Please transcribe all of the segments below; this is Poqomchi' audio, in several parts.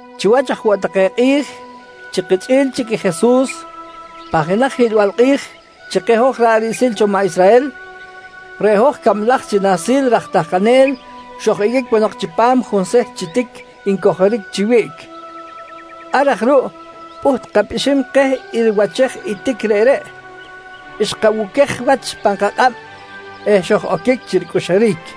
Chiwach aj woꞌ take kꞌi̱j chi kichꞌi̱l chic i Jesus, pan jenaj hiꞌlbal kꞌi̱j chi keh hoj ra̱ꞌ riꞌsil cho maꞌ Israhel, reꞌ hoj cablaj chi nahsil raj tahkanel xoj-iqꞌuic ponok chipam junseht chi tic ncojoric chi wiꞌc. Ar aj ruꞌ pꞌuht kapꞌixim keh i riwachej i tic reꞌreꞌ, xkabuquej wach pan kakꞌab eh xoj-oquic chi ricꞌuxuric.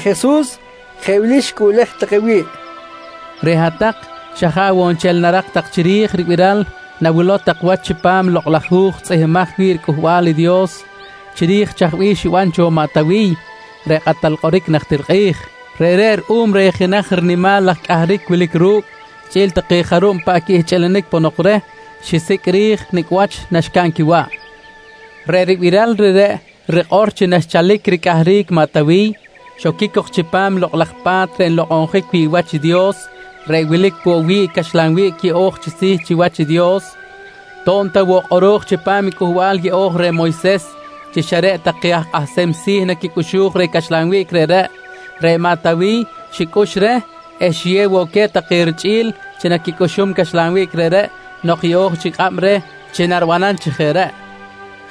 Reꞌ Jesus jeꞌ wili xicꞌuꞌlej take wi̱ꞌ: «Reꞌ hat-tak xa jaꞌ woꞌ nchel narak ta tak chiri̱j i ribiral nawilow tak wach chipam i Lokꞌ laj Hu̱j tzꞌihmbimaj wi̱ꞌ riCꞌuhbal i Dios chiri̱j chaj bih xiban cho i maꞌ Tawiy reꞌ kꞌatal kꞌoric najtir kꞌi̱j. Reꞌreꞌ ruꞌum reh jenaj rinimal laj cꞌahric wilic ru̱cꞌ chꞌi̱l take jarub paꞌ quihchꞌilinic ponok reh, xisicꞌ ri̱j nicꞌ wach naxcaꞌn quiwaꞌ. Reꞌ ribiral reꞌreꞌ rikꞌor chi naxchalic ricꞌahric maꞌ Tawiy, xoquic cok chipam i Lokꞌ laj Pa̱t reꞌ nlokꞌonjic wi̱ꞌ wach i Dios reꞌ wilic woꞌ wi̱ꞌ i caxlan wiꞌc yeꞌo̱j chi si̱ chiwach i Dios. To̱b ta woꞌ kꞌoro̱j chipam i Cꞌuhbal Yeꞌo̱j reh Moyses chi xa reꞌ take aj kꞌahsem si̱ naquicꞌuxuj reh caxlan wiꞌc reꞌreꞌ, reꞌ maꞌ Tawiy xicꞌux reh eh xiyew woꞌ queh take richꞌi̱l chi naquicꞌuxum caxlan wiꞌc reꞌreꞌ nok yeꞌo̱j chic kꞌab reh chi naribanam chi jeꞌ reꞌ.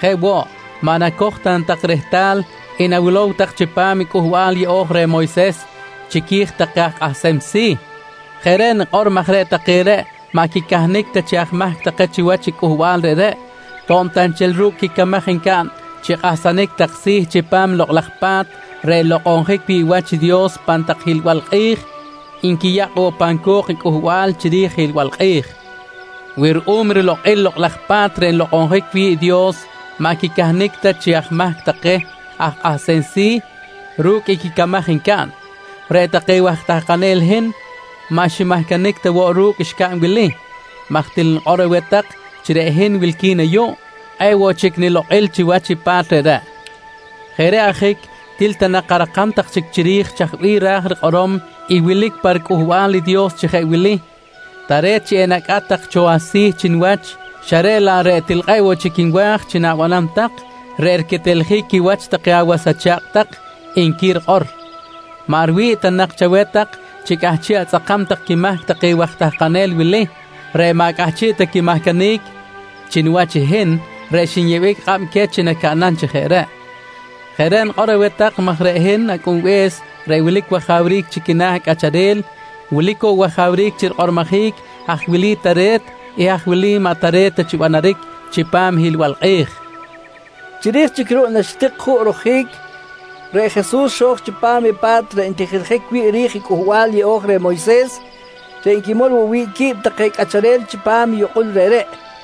Jeꞌ woꞌ, maꞌ nacoj ta na tak rehtal i nawilow tak chipam i Cꞌuhbal Yeꞌo̱j reh Moyses chiqui̱j take aj kꞌahsem si̱? Jeꞌ reꞌ nikꞌor maj reꞌ take reꞌ maꞌ quicahnic ta chi aj mahc take chiwach i cꞌuhbal reꞌreꞌ, to̱b ta nchel ru̱cꞌ i quicamaj ncaꞌn chi kꞌahsanic tak si̱ chipam i Lokꞌ laj Pa̱t reꞌ nlokꞌonjic wi̱ꞌ wach i Dios pan tak hiꞌlbal kꞌi̱j nquiyakꞌ woꞌ pan co̱k i cꞌuhbal chiri̱j i hiꞌlbal kꞌi̱j. Wi ruꞌum rilokꞌil i Lokꞌ laj Pa̱t reꞌ nlokꞌonjic wi̱ꞌ i Dios maꞌ quicahnic ta chi aj mahc take aj kꞌahsem si̱ ru̱cꞌ i quicamaj ncaꞌn, reꞌ take waj tahkanel hin maꞌ ximahcanic ta woꞌ ru̱cꞌ xcaꞌn wili, maj til nikꞌor aweh tak chi reꞌ hin reꞌ wilqui̱n ayuꞌ, kꞌe̱ꞌ woꞌ chic nilokꞌil chiwach i pa̱t reꞌreꞌ. Jeꞌ reꞌ ajic til ta nak arakam tak chic chiri̱j chaj bih ra̱j rikꞌorom i wilic pa riCꞌuhbal i Dios chi jeꞌ wili: “Tare̱t chi enacꞌat tak cho asi̱ chi niwach, xa reꞌ laꞌ reꞌ til woꞌ chic kꞌe̱ꞌ nwa̱j chi na̱banam tak, reꞌ riqueteljic quiwach take awas acha̱kꞌ tak, nqui rikꞌor. «Maꞌ riwi̱ꞌ ta nak chaweh tak chi cꞌahchiꞌ atzꞌakam tak quimahc take waj tahkanel wili reꞌ maꞌ cꞌahchiꞌ ta quimahcanic chi niwach i hin reꞌ xinyeꞌbic kꞌab queh chi nacaꞌnam chi jeꞌ reꞌ. Jeꞌ reꞌ nikꞌor aweh tak maj reꞌ hin Acꞌunbe̱s reꞌ wilic wajawric chi quina̱ cꞌacharel wilic woꞌ wajawric chi rikꞌormojic haj wilic i tare̱t eh haj wilic i maꞌ tare̱t ta chi banaric chipam i hiꞌlbal kꞌi̱j, nqui Jesus queh. Chiri̱j chic ruꞌ naxitik juꞌ rojic, reꞌ Jesus xo̱j chipam i pa̱t reꞌ ntijiljic wi̱ꞌ ri̱j i Cꞌuhbal Yeꞌo̱j reh Moyses, reꞌ nquimol woꞌ wi̱ꞌ qui̱b take cꞌacharel chipam i yukꞌul reꞌreꞌ.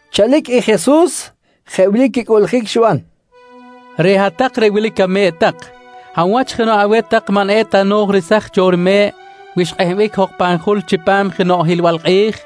Chalic i Jesus jeꞌ wili quicꞌuꞌljic xiban: «Reꞌ hat-tak reꞌ wilic ame̱ꞌ tak, hab wach jenoꞌ aweh tak maꞌ eta no̱j resaj cho jenoꞌ rime̱ꞌ wi xkꞌehbic jok pan jul chipam jenoꞌ hiꞌlbal kꞌi̱j?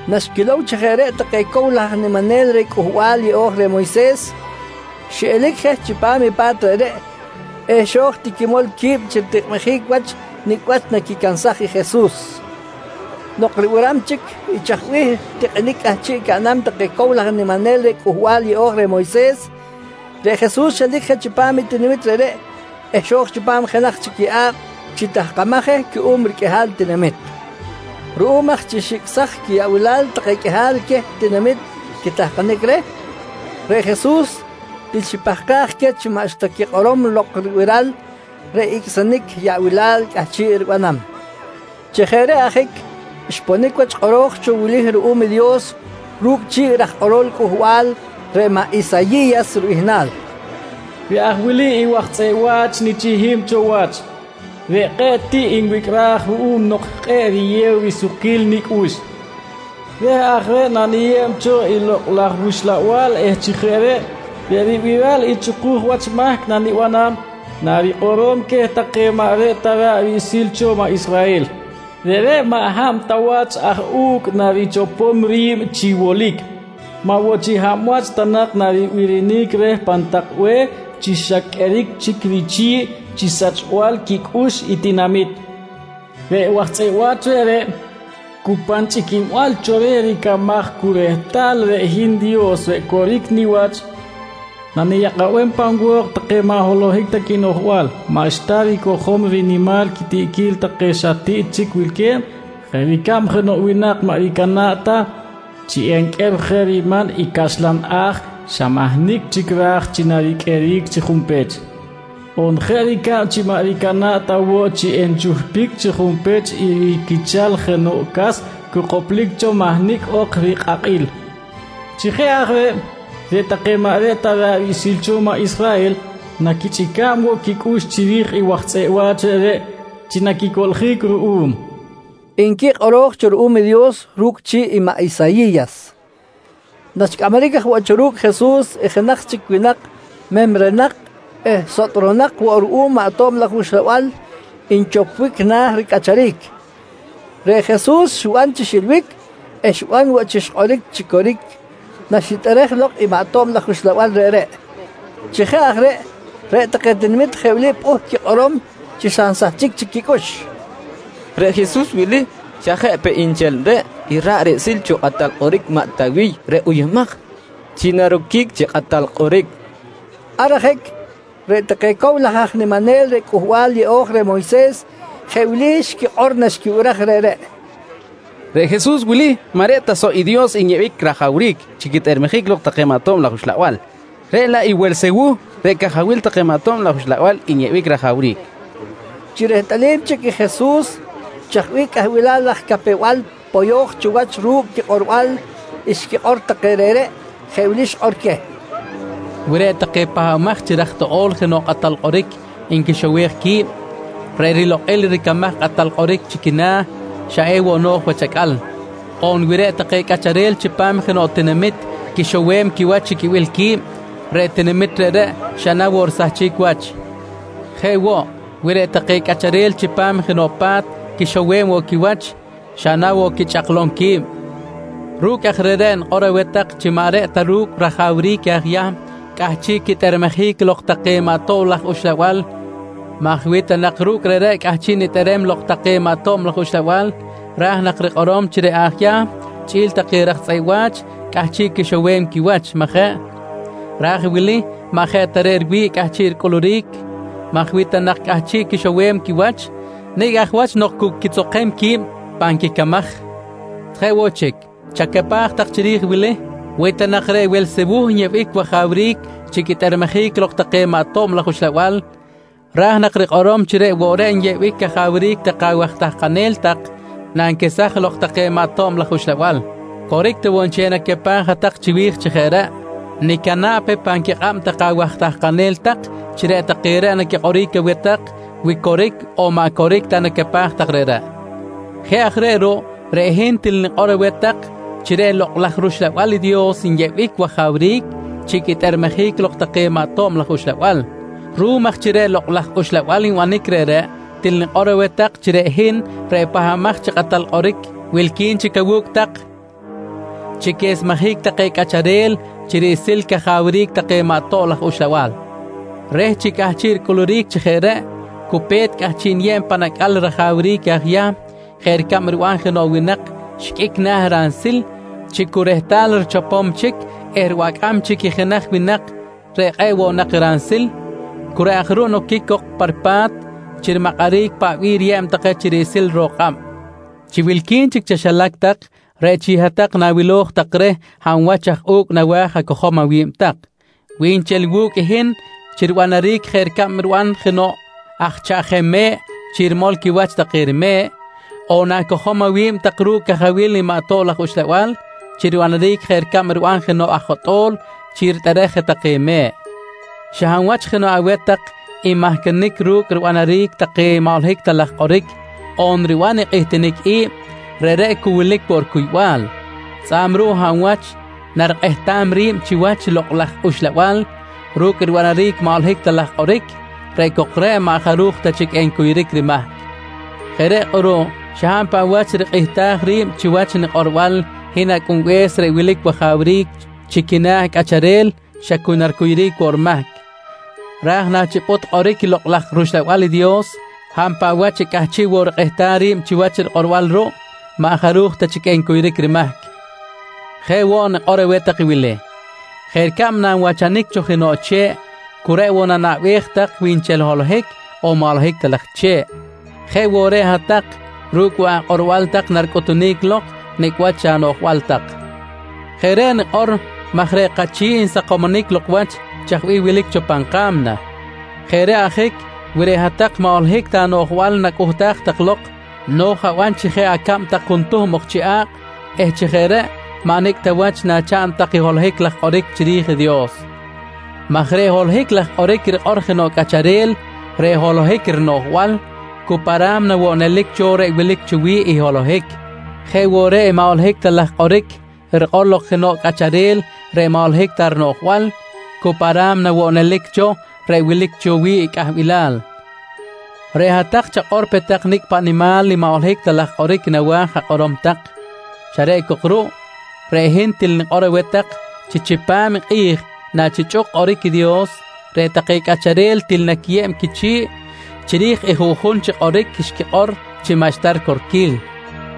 Naxquilow chi jeꞌ reꞌ take cow laj aj niminel reh Cꞌuhbal Yeꞌo̱j reh Moyses, xiꞌelic je chipam i pa̱t reꞌreꞌ eh xo̱j ti quimol qui̱b chi ritikꞌmijic wach nicꞌ wach naquicansaj i Jesus. Nok ribiram chic i chaj bih tikꞌinic cꞌahchiꞌ caꞌnam take cow laj aj niminel reh Cꞌuhbal Yeꞌo̱j reh Moyses, reꞌ Jesus xelic je chipam i tinamit reꞌreꞌ eh xo̱j chipam jenaj chic yeꞌa̱b chi tahkamaj je cuꞌum riqꞌuihal tinamit. Ruꞌum aj chi xicꞌsaj quiyaꞌbilal take qꞌuihal queh tinamit quitahkanic reh, reꞌ Jesus til xipahkaj queh chi maꞌxta quikꞌorom lok ribiral reꞌ icꞌsinic yaꞌbilal cꞌahchiꞌ ribanam. Chi jeꞌ reꞌ ajic, xponic wach i kꞌoro̱j cho wili ruꞌum i Dios ru̱cꞌ chi̱ꞌ i raj kꞌorol Cꞌuhbal, reꞌ maꞌ Isayi̱yas ribihnal: “Reꞌ aj wili i waj tzꞌeꞌ wa̱ch nichihim cho wach, reꞌ kꞌe̱ꞌ tiꞌ nwicꞌraj ruꞌum nok kꞌe̱ꞌ riyew sukquil nicꞌux. Reh aj reꞌ naniyeb cho i Lokꞌ laj wUxlabal eh chi jeꞌ reꞌ, reꞌ ribiral i chꞌukuj wach mahc nanibanam, narikꞌorom queh take maꞌ reꞌ ta ra̱ꞌ riꞌsil cho maꞌ Israhel. Reꞌreꞌ maꞌ hab ta wach aj u̱cꞌ narichopom ri̱b chi wolic, maꞌ woꞌ chi hab wach ta nak naribirinic reh pan tak be̱h chi xa qꞌueric chic richi̱ꞌ chi sachbal quicꞌux i tinamit. Reꞌ waj tzꞌeꞌ wa̱ch reꞌreꞌ cu pan chꞌiquinbal cho reh ricamaj cu rehtal reꞌ hin Dios reꞌ coric niwach naniyakꞌabem pan wo̱k take maꞌ holohic ta quinoꞌjbal, maꞌxta ricojom riman quitiꞌquil take xa tiꞌ chic wilque̱b jeꞌ ricab jenoꞌ winak maꞌ ricana̱ꞌ ta chi enqꞌuer je riman i caxlan a̱j xa mahnicꞌ chic ra̱j chi nariqꞌueric chi junpech, on jeꞌ ricab chi maꞌ ricana̱ꞌ ta woꞌ chi enchuhpic chi junpech i riquichal jenoꞌ cas cu koplic cho mahnicꞌ ok rikꞌakꞌil. Chi jeꞌ aj reꞌ, reꞌ take maꞌ reꞌ ta ra̱ꞌ riꞌsil cho maꞌ Israhel naquichꞌica̱b woꞌ quicꞌux chiri̱j i waj tzꞌeꞌ wa̱ch reꞌreꞌ chi naquicoꞌljic ruꞌum, nqui kꞌoro̱j cho ruꞌum i Dios ru̱cꞌ chi̱ꞌ i maꞌ Isayi̱yas. Naxcꞌamaric aj woꞌ cho ru̱cꞌ Jesus i jenaj chic winak memrenak eh sotꞌronak woꞌ ruꞌum maꞌ tob laj uxlabal nchopbic na̱ ricꞌacharic, reꞌ Jesus xiban chi xilbic eh xiban woꞌ chi xkꞌoric chi coric naxitꞌerej lok i maꞌ tob laj uxlabal reꞌreꞌ. Chi jeꞌ aj reꞌ, reꞌ take tinamit jeꞌ wili pꞌuht quikꞌorom chi xa nsahchic chic quicꞌux: «Reꞌ Jesus wili, xa jeꞌ peꞌ nchel reꞌ i ra̱ꞌ riꞌsil cho kꞌatal kꞌoric maꞌ Tawiy reꞌ uyumaj chi naroquic chi kꞌatal kꞌoric, nqui take. Ar ajic reꞌ take cow laj aj niminel reh Cꞌuhbal Yeꞌo̱j reh Moyses jeꞌ wili xquikꞌor naxquibiraj reꞌreꞌ: «Reꞌ Jesus wili, maꞌ reꞌ ta soꞌ i Dios nyeꞌbic rajawric chi quitꞌermejic lok take maꞌ tob laj uxlabal, reꞌ laꞌ i Welsewuh reꞌ cajawil take maꞌ tob laj uxlabal nyeꞌbic rajawric, nqui take. Chi rehtꞌalim chic i Jesus chaj bih cꞌahbil laj capew-bal poyo̱j cho wach ru̱cꞌ quikꞌorbal xquikꞌor take reꞌreꞌ, jeꞌ wili xikꞌor queh: «Wi reꞌ take pahbamaj chi raj toꞌo̱l jenoꞌ kꞌatal kꞌoric nquixowej qui̱b, reꞌ rilokꞌil ricamaj i kꞌatal kꞌoric chi quina̱, xa ewoꞌ no̱j wach acꞌal. On wi reꞌ take cꞌacharel chipam jenoꞌ tinamit quixowem quiwach chi quibil qui̱b, reꞌ tinamit reꞌreꞌ xa na woꞌ risahchic wach. Jeꞌ woꞌ, wi reꞌ take cꞌacharel chipam jenoꞌ pa̱t quixowem woꞌ quiwach, xa na woꞌ quichꞌaklom qui̱b? Ru̱cꞌ aj reꞌreꞌ nikꞌor aweh tak chi maꞌ reꞌ ta ru̱cꞌ rajawric aj Yahm cꞌahchiꞌ quitꞌermejic lok take maꞌ tob laj uxlabal maj wi ta nak ru̱cꞌ reꞌreꞌ cꞌahchiꞌ nitꞌerem lok take maꞌ tob laj uxlabal, ra̱j nak rikꞌorom chi reꞌ aj Yahm chꞌi̱l take raj tzꞌeꞌ wa̱ch cꞌahchiꞌ quixowem quiwach, majeꞌ? Raj i wili maꞌ jeꞌ ta reꞌ riwi̱ꞌ cꞌahchiꞌ ricꞌuluric maj wi ta nak cꞌahchiꞌ quixowem quiwach, nicꞌ aj wach nok cu quitzokem qui̱b pan quicamaj. «Jeꞌ woꞌ chic, chacapaj tak chiri̱j i wili: Wi ta nak reꞌ Welsewuh nyeꞌbic wajawric chi quitꞌermejic lok take maꞌ tob laj uxlabal, ra̱j nak rikꞌorom chi reꞌ woꞌ reꞌ nyeꞌbic cajawric take awaj tahkanel tak nanquesaj lok take maꞌ tob laj uxlabal. Coric ta woꞌ nchel i nacapaj hat-tak chiwi̱j chi jeꞌ reꞌ, nicana̱ꞌ pe pan quikꞌab take awaj tahkanel tak chi reꞌ take reꞌ naquikꞌoric aweh tak, wi coric on maꞌ coric ta i nacapaj tak reꞌreꞌ. Jeꞌ aj reꞌ ruꞌ, reꞌ hin til nikꞌor aweh tak chi reꞌ Lokꞌ laj rUxlabal i Dios nyeꞌbic wajawric chi quitꞌermejic lok take maꞌ tob laj uxlabal. Ruꞌum aj chi reꞌ Lokꞌ laj Uxlabal nbanic reꞌreꞌ, til nikꞌor aweh tak chi reꞌ hin reꞌ Pahbamaj chi Kꞌatal Kꞌoric, wilqui̱n chic awu̱cꞌ tak chi quesmejic take cꞌacharel chi riꞌsil cajawric take maꞌ tob laj uxlabal. Reh chi cꞌahchiꞌ ricꞌuluric chi jeꞌ reꞌ, cu pe̱t cꞌahchiꞌ niyeb pan acꞌal i rajawric aj Yahm jeꞌ ricab riban jenoꞌ winak xiqꞌuic na̱ ransil chi cu rehtal richopom chic eh ribacꞌam chic i jenaj winak reꞌ kꞌe̱ꞌ woꞌ nak ransil, cu reꞌ aj ruꞌ noquic cok pa ripa̱t chi rimakꞌaric i paꞌ bih riyeb take chi riꞌsil ro̱k kꞌab. «Chi wilqui̱n chic chaxilac tak, reꞌ chic hat-tak na̱wiloj tak reh hab wach aj u̱cꞌ nawa̱j acojom awi̱b tak, wi nchel wu̱cꞌ i hin chi ribanaric jeꞌ ricab riban jenoꞌ aj chaꞌjem me̱ꞌ chi rimol quiwach take rime̱ꞌ, on na̱cojom awi̱b tak ru̱cꞌ i cajawil i maꞌ tob laj uxlabal chi ribanaric jeꞌ ricab riban jenoꞌ aj jotꞌo̱l chi ritꞌerej je take me̱ꞌ. Xa hab wach jenoꞌ aweh tak nmahcanic ru̱cꞌ ribanaric take maꞌ holohic ta laj kꞌoric on riban i kꞌihtinic i̱b, reꞌreꞌ cu wilic woꞌ ricuybal. Tzꞌa̱b ruꞌ hab wach narikꞌehtam ri̱b chiwach i Lokꞌ laj Uxlabal ru̱cꞌ ribanaric maꞌ holohic ta laj kꞌoric, reꞌ cok reꞌ maꞌ jaruj ta chic encuyuric rimahc. «Jeꞌ reꞌ kꞌuruꞌ xa hab paꞌ wach rikꞌihtaj ri̱b chiwach nikꞌorbal hin Acꞌunbe̱s reꞌ wilic wajawric chi quina̱ cꞌacharel xa cu na ricuyuric woꞌ rimahc, raj nachipꞌut kꞌoric i Lokꞌ laj rUxlabal i Dios, hab paꞌ wach xa cꞌahchiꞌ woꞌ rikꞌehtam ri̱b chiwach rikꞌorbal ruꞌ, maꞌ jaruj ta chic encuyuric rimahc. Jeꞌ woꞌ nikꞌor aweh tak i wili: Jeꞌ ricab nanwachanic cho jenoꞌ che̱ꞌ cu reꞌ woꞌ nanaꞌbej tak wi nchel holohic on maꞌ holohic laj che̱ꞌ, jeꞌ woꞌ reꞌ hat-tak ru̱cꞌ woꞌ akꞌorbal tak naricꞌutunic lok nicꞌ wach anoꞌjbal tak. Jeꞌ reꞌ nikꞌor maj reꞌ kachi̱ꞌ nsakomonic lok wach chaj bih wilic cho pan ka̱mna. Jeꞌ reꞌ ajic, wi reꞌ hat-tak maꞌ holohic ta anoꞌjbal tak nacꞌuhtaj tak lok, no̱j aban tak chi jeꞌ acab tak juntuhm ok chi a̱kꞌ eh chi jeꞌ reꞌ, maꞌ nicꞌ ta wach nachaꞌn tak holohic laj kꞌoric chiri̱j i Dios, maj reꞌ holohic laj kꞌoric rikꞌor jenoꞌ cꞌacharel reꞌ holohic rinoꞌjbal, cu pa ra̱mna woꞌ nelic cho reꞌ wilic cho wi̱ꞌ i holohic. Jeꞌ woꞌ reꞌ i maꞌ holohic ta laj kꞌoric rikꞌor lok jenoꞌ cꞌacharel reꞌ maꞌ holohic ta rinoꞌjbal, cu pa ra̱mna woꞌ nelic cho reꞌ wilic cho wi̱ꞌ cꞌahbilal. Reꞌ hat-tak chakꞌor pe tak nicꞌ paꞌ nimal maꞌ holohic ta laj kꞌoric nawa̱j akꞌorom tak, xa reꞌ cok ruꞌ, reꞌ hin til nikꞌor aweh tak chi chipam i kꞌi̱j nachichꞌuk kꞌoric i Dios, reꞌ take cꞌacharel til naquiyeb quichi̱ꞌ chiri̱j i juꞌjun chi kꞌoric xquikꞌor chi maꞌxta ricorquil.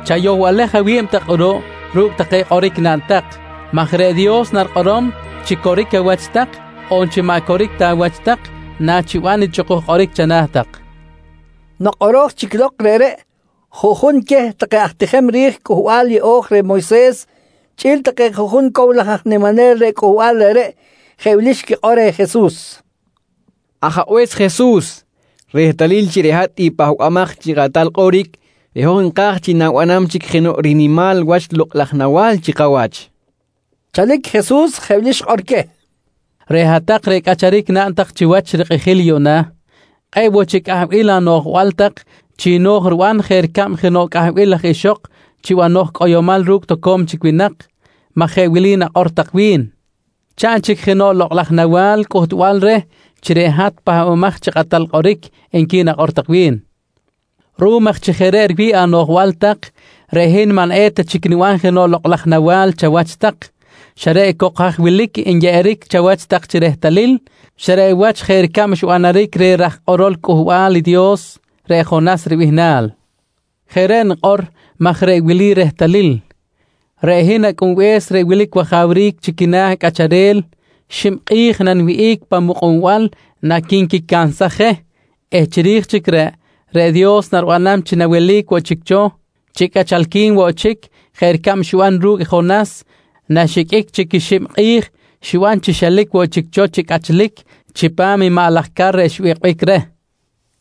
Chayohbalej awi̱b tak kꞌuruꞌ ru̱cꞌ take kꞌoric naꞌn tak, maj reꞌ Dios narikꞌorom chi coric awach tak on chi maꞌ coric ta awach tak nachiban i chꞌukuj kꞌoric chana̱ tak, nqui Jesus queh. Nok kꞌoro̱j chic lok reꞌreꞌ, juꞌjun queh take aj tijem ri̱j Cꞌuhbal Yeꞌo̱j reh Moyses chꞌi̱l take juꞌjun cow laj aj niminel reh cꞌuhbal reꞌreꞌ, jeꞌ wili xquikꞌor reh Jesus: «Ajabe̱s Jesus, rehtalil chi reꞌ hat i Pahbamaj chi Kꞌatal Kꞌoric reꞌ hoj nka̱j chi na̱banam chic jenoꞌ rinimal wach lokꞌ laj nawa̱l chi kawach, nqui take reh. Chalic Jesus jeꞌ wili xikꞌor queh: «Reꞌ hat-tak reꞌ cꞌacharic naꞌn tak chiwach rikꞌijil yuꞌna, kꞌe̱ꞌ woꞌ chic cꞌahbil anoꞌjbal tak chi no̱j riban jeꞌ ricab jenoꞌ cꞌahbil laj ixok chi banoj cꞌoyomal ru̱cꞌ toco̱m chic winak maj jeꞌ wili nakꞌor tak wi̱n: ‹Chaꞌn chic jenoꞌ lokꞌ laj nawa̱l cꞌuhtbal reh chi reꞌ hat i Pahbamaj chi Kꞌatal Kꞌoric, nqui nakꞌor tak wi̱n. «Ruꞌum aj chi jeꞌ reꞌ riwi̱ꞌ anoꞌjbal tak, reꞌ hin maꞌ eta chic niban jenoꞌ lokꞌ laj nawa̱l chawach tak, xa reꞌ cok haj wilic enyeꞌeric chawach chi rehtalil, xa reꞌ wach jeꞌ ricab xbanaric reh i raj kꞌorol Cꞌuhbal i Dios, reꞌ Jonas ribihnal. Jeꞌ reꞌ nikꞌor maj reꞌ wili i rehtalil: Reꞌ hin Acꞌunbe̱s reꞌ wilic wajawric chi quina̱ cꞌacharel xib kꞌi̱j naniwihꞌic pan mukꞌunbal naquinquicansaj je eh chiri̱j chic reꞌ, reꞌ Dios naribanam chi nawelic woꞌ chic cho chi cꞌachalqui̱n woꞌ chic jeꞌ ricab xiban ru̱cꞌ i Jonas naxiqꞌuic chic xib kꞌi̱j xiban chi xelic woꞌ chic cho chi cꞌachlic chipam i maꞌ laj car reꞌ xbikꞌbic reh.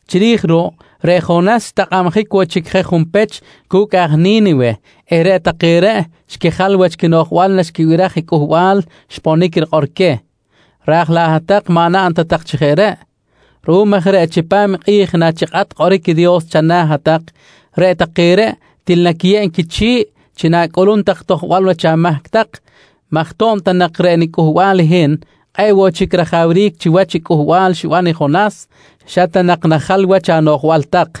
Chiri̱j ruꞌ, reꞌ Jonas xtakꞌabjic woꞌ chic je junpech cu̱cꞌ aj Ni̱niwe eh reꞌ take reꞌ xquijal wach quinoꞌjbal naxquibiraj i cꞌuhbal xponic rikꞌor queh, raj laꞌ hat-tak maꞌ naꞌn ta tak chi jeꞌ reꞌ. Ruꞌum aj reꞌ chipam i kꞌi̱j nachikꞌat kꞌoric i Dios chana̱ hat-tak, reꞌ take reꞌ til naquiyeb quichi̱ꞌ chi na̱cꞌulum tak i tojbal wach amahc tak maj to̱b ta nak reꞌ niCꞌuhbal i hin kꞌe̱ꞌ woꞌ chic rajawric chiwach i cꞌuhbal xiban i Jonas, xa ta nak najal wach anoꞌjbal tak.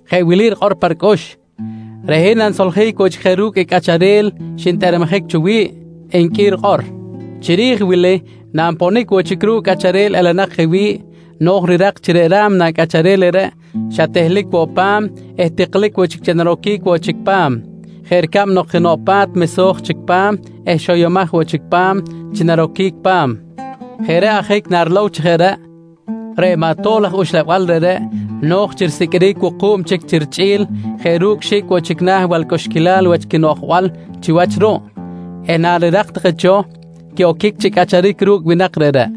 jeꞌ wili rikꞌor pa ricꞌux: ‹Reꞌ hin nanisoljic woꞌ chic je ru̱cꞌ i cꞌacharel xintꞌermejic cho wi̱ꞌ, nqui rikꞌor. «Chiri̱j wili nanponic woꞌ chic ru̱cꞌ cꞌacharel elenak je wi̱ꞌ, no̱j rirak chi reꞌ ra̱mna cꞌacharel reꞌreꞌ xa tehlic woꞌ pa̱m eh tiklic chic chi naroquic woꞌ chic pa̱m, jeꞌ ricab nok jenoꞌ pa̱t mesoj chic pa̱m eh xoyomaj woꞌ chic pa̱m chi naroquic pa̱m. Jeꞌ reꞌ ajic, narilow chi jeꞌ reꞌ, reꞌ maꞌ tob laj uxlabal reꞌreꞌ no̱j chi risiqꞌuiric wuku̱b chic chi richꞌi̱l jeꞌ ru̱cꞌ xi̱cꞌ woꞌ chic na̱ balcꞌuxquilal wach quinoꞌjbal chiwach ruꞌ eh narirak take cho, quiꞌoquic chi cꞌacharic ru̱cꞌ winak reꞌreꞌ.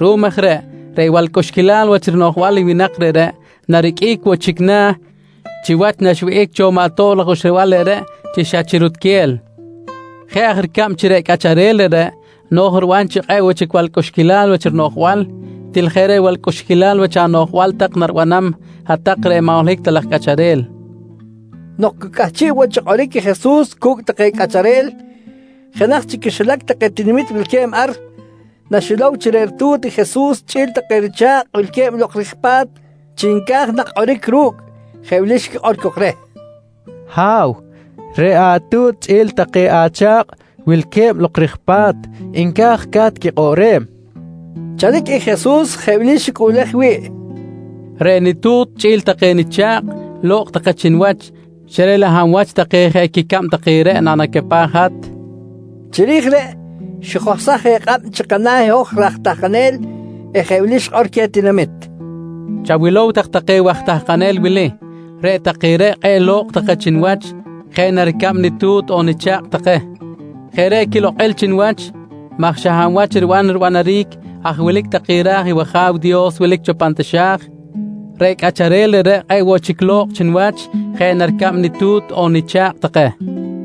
Ruꞌum aj reꞌ, reꞌ balcꞌuxquilal wach rinoꞌjbal i winak reꞌreꞌ nariqꞌuic woꞌ chic na̱ chiwach naxwihꞌic cho maꞌ tob laj uxlabal reꞌreꞌ chi xa chi rutquel. Jeꞌ aj ricab chi reꞌ cꞌacharel reꞌreꞌ no̱j riban chi kꞌe̱ꞌ woꞌ chic balcꞌuxquilal wach rinoꞌjbal, til jeꞌ reꞌ balcꞌuxquilal wach anoꞌjbal tak naribanam hat-tak reꞌ maꞌ holohic ta laj cꞌacharel, nqui xikꞌor queh. Nok cu cꞌahchiꞌ woꞌ chi kꞌoric i Jesus cu̱cꞌ take cꞌacharel, jenaj chi quixilac take tinamit wilque̱b ar, naxilow chi reꞌ ritu̱t i Jesus chꞌi̱l take richa̱kꞌ wilque̱b lok rij pa̱t chi nca̱j nak kꞌoric ru̱cꞌ jeꞌ wili xikꞌor cok reh: «Ha̱w, reꞌ atu̱t chꞌi̱l take acha̱kꞌ wilque̱b lok ri̱j pa̱t, nca̱j ca̱t quikꞌoꞌrem, nqui cok reh. Chalic i Jesus jeꞌ wili xicꞌuꞌlej wi̱ꞌ: «Reꞌ nitu̱t chꞌi̱l take nicha̱kꞌ, lo̱kꞌ take chi niwach xa reꞌ laꞌ hab wach take jeꞌ quicab take reꞌ nanacapaj i hat? nqui reh. Chiri̱j reꞌ, xijohsaj je kꞌab chi kana̱ i hoj raj tahkanel eh jeꞌ wili xikꞌor queh tinamit: «Chawilow tak take waj tahkanel wili. Reꞌ take reꞌ kꞌe̱ꞌ lo̱kꞌ take chi niwach, jeꞌ na ricab nitu̱t on nicha̱kꞌ take. Jeꞌ reꞌ quilokꞌil chi niwach maj xa hab wach riban ribanaric haj wilic take ra̱j i wAja̱w Dios wilic cho pan taxa̱j, reꞌ cꞌacharel reꞌreꞌ kꞌe̱ꞌ woꞌ chic lo̱kꞌ chi niwach jeꞌ na ricab nitu̱t on nicha̱kꞌ take, nqui Jesus.